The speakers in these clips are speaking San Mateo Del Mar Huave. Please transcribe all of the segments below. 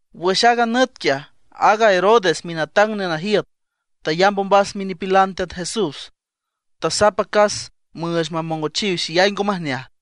Wüx aaga nüt quiaj, aaga Herodes minatang nenajiüt tayamb ombas minipilan Teat Jesús. Tasap acas müüch mamongochiw xeyay ngo majneaj.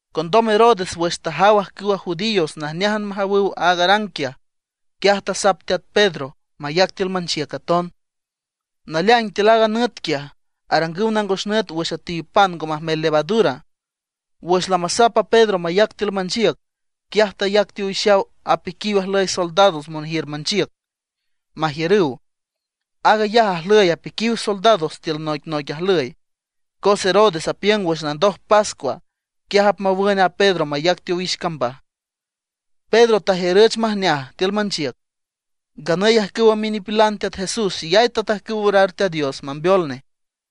Condom Herodes wüx tajaw ajcüwa judíos najneájan majawüw aaga arang quiaj, quiaj tasap teat Pedro mayac tiül manchiüc aton. Naleaing tiül aaga nüt quiaj arangüw nangos nüt wüx üetiw pan ngo majmel levadura. Wüx lamasap a Pedro mayac tiül manchiüc, quiaj tayac teowixaw apiquiw ajlüy soldados monjiür manchiüc, majiürüw. Aag ayaj ajlüy apiquiw soldados tiül noicnoic ajlüy. Cos Herodes apiüng wüx landoj pascua, quiaj apmawün a Pedro mayac teowix cambaj. Pedro tajiürüch majneaj tiül manchiüc. Nganüy ajcüwa minipilan Teat Jesús xeyay tatajcüw orar Teat Dios mambeol nej.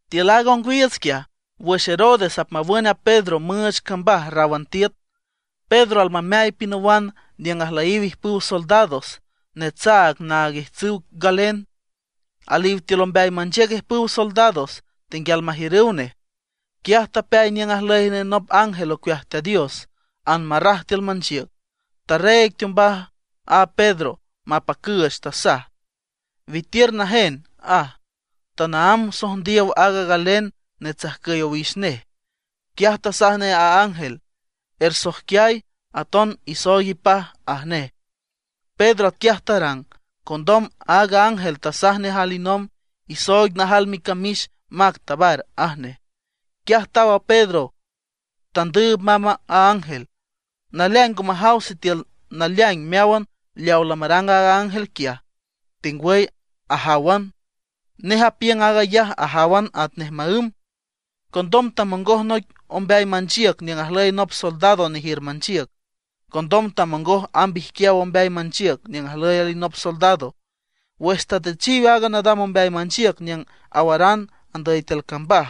Tiül aaga ongwiiüts quiaj, wüx Herodes apmawün a Pedro müüch cambaj ráwan tiüt, Pedro almameay pinawan niüng ajlüyiw ijpüw soldados. Netsaag naag ijtsüw galen; aliw tiül ombeay manchiüc alijpüw soldados tenguial majiürüw nej. Quiaj tapeay niüng ajlüy nej nop ángel ocueaj Teat Dios, anmarraj tiül manchiüc, tareeg teombaj a Pedro mapacüüch, tasaj: ―Witiür najénan ―aj. Tanaámb sojndiow aaga galen netsajcüy owix nej. Quiaj tasaj nej a ángel: ―Ersoijquiay, aton isooig ipaj ―aj nej. Pedro atquiaj tarang. Condom aaga ángel tasaj nej alinomb: ―Isooig najal micamix, mac tabar ―aj nej. Quiaj taw a Pedro tandüüb mamb a ángel. Naleaing ngo majaw sitiül naleaing meáwan leaw lamarang aaga ángel quiaj, tengwüy ajáwan. Nej apiüng aag ayaj ajáwan atnej maǘm. Condom tamongoj noic ombeay manchiüc niüng ajlüy nop soldado nejiür manchiüc. Condom tamongoj amb ijquiaw ombeay manchiüc niüng ajlüy alinop soldado. Wüx tatüchiw aaga nadam ombeay manchiüc niüng awaran andüy tiül cambaj,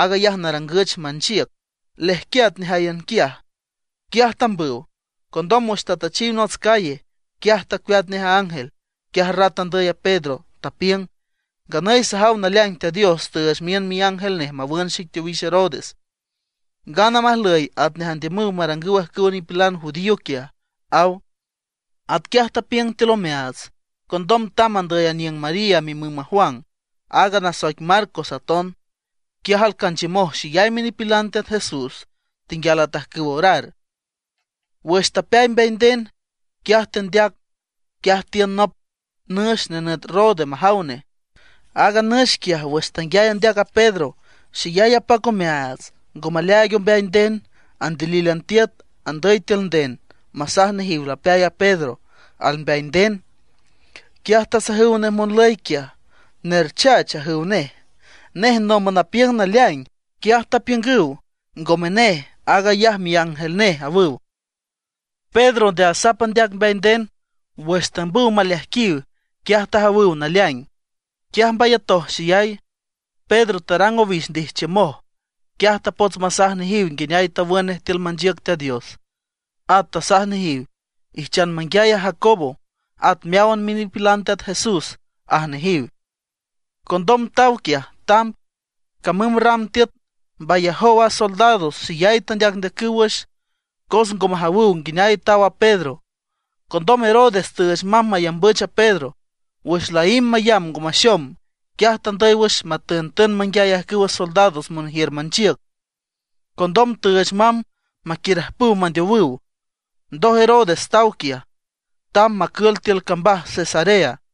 aag ayaj narangüch manchiüc, lejquiat nejáyan quiaj. Quiaj tambüw. Condom wüx tatüchiw nots calle, quiaj tacueat nej a ángel. Quiaj rat andüy a Pedro, tapiüng: ―Nganüy sajaw naleaing Teat Dios tüüch miün miángel nej mawün xic teowix Herodes, ngana majlüy atnej andiümüw marangüw ajcüwa nipilan judío quiaj ―aw. Atquiaj tapiüng tiül omeaats, condom tamb andüy aniüng María mimüm a Juan, aaga nasoic Marcos aton. Quiaj alcanchiümoj xeyay minipilan Teat Jesús tenguial atajcüw orar. Wüx tapeay mbeay nden, quiaj tendeac. Quiaj tiün nop nüx nenüt Rode majaw jane. Aaga nüx quiaj wüx tanguiay andeac a Pedro, xeyay apac omeaats, ngo maleaaig ombeay nden, andilílan tiüt andüy tiül nden masaj nejiw lapeay a Pedro, al mbeay nden. Quiaj tasajüw nej monlüy quiaj: ―¡Nerchach! ―ajüw nej. Nej nomb apiüng naleaing. Quiaj tapiüngüw: ―Ngome nej, aag ayaj miángel nej ―awüw. Pedro nde asap andeac mbeay nden. Wüx tambüw maleajquiw, quiaj tajawüw naleaing. Quiaj mbayatoj xeyay. Pedro tarang owix ndijchiümoj. Quiaj tapots masaj nejiw nguineay tawün nej tiül manchiüc Teat Dios. At tasaj nejiw: ―Ijchan manguiay a Jacobo, at meáwan minipilan Teat Jesús ―aj nejiw. Condom taw quiaj, tamb. Camüm ram tiüt mbayajow a soldados. Xeyay tendeacndeacüw wüx, cos ngo majawüw nguineay taw a Pedro. Condom Herodes tüüch mamb mayambüch a Pedro. Wüx laímb mayamb ngo maxom, quiaj tandüy wüx matüntün manguiay ajcüwa soldados monjiür manchiüc. Condom tüüch mamb maquiürajpüw mandeowüw. Ndoj Herodes taw Judea, tamb macül tiül cambaj Cesarea.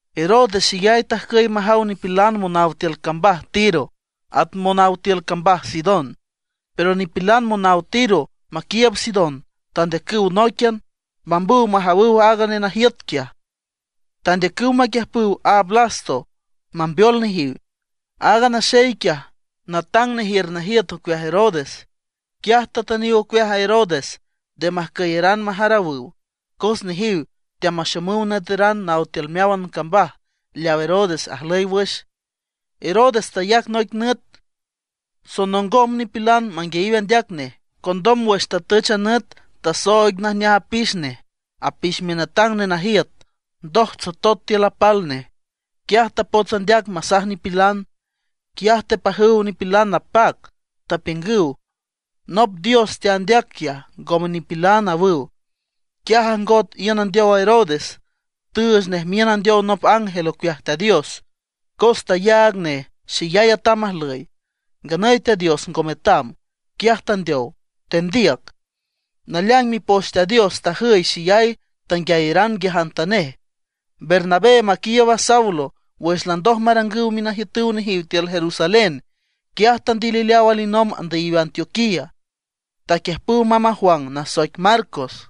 Herodes xeyay tajcüy majaw nipilan monaw tiül cambaj Tiro at monaw tiül cambaj Sidón. Pero nipilan monaw Tiro maquiiüb Sidón tandeacüw nóiquian, mambüw majawüw aaga nenajiüt quiaj. Tandeacüw maquiüjpüw a Blasto mambeol nejiw. Aaga naxey quiaj, natang nejiür najiüt ocueaj Herodes. Quiaj tatüniw ocueaj a Herodes nde majcüyaran majarawüw. Cos nejiw teamaxomüw nüeteran naw tiül meáwan cambaj leaw Herodes ajlüy wüx. Herodes tayac noic nüt sonongom nipilan manguiayiw andeac nej. Condom wüx tatüch a nüt, tasooig najneaj apix nej, apix minatang nenajiüt. Ndoj tsotot tiül apal nej. Quiaj tapots andeac masaj nipilan. Quiaj tepajüw nipilan napac. Tapiüngüw: ―¡Nop dios teandeac quiaj, ngome nipilan! ―awüw. Quiaj ajngot iün andeow a Herodes, tüüch nej miün andeow nop ángel ocueaj Teat Dios, cos tayaag nej xeyay atam ajlüy; nganüy Teat Dios ngo metam. Quiaj tandeow, tendiüc. Naleaing Mipoch Teat Dios tajüy xeyay, tanguiayaran nguiajantanej. Bernabé maquiiüb a Saulo wüx landoj marangüw minajiütüw nejiw tiül Jerusalén, quiaj tandilileaw alinomb andüyiw Antioquía, taquiüjpüw mamb a Juan nasoic Marcos.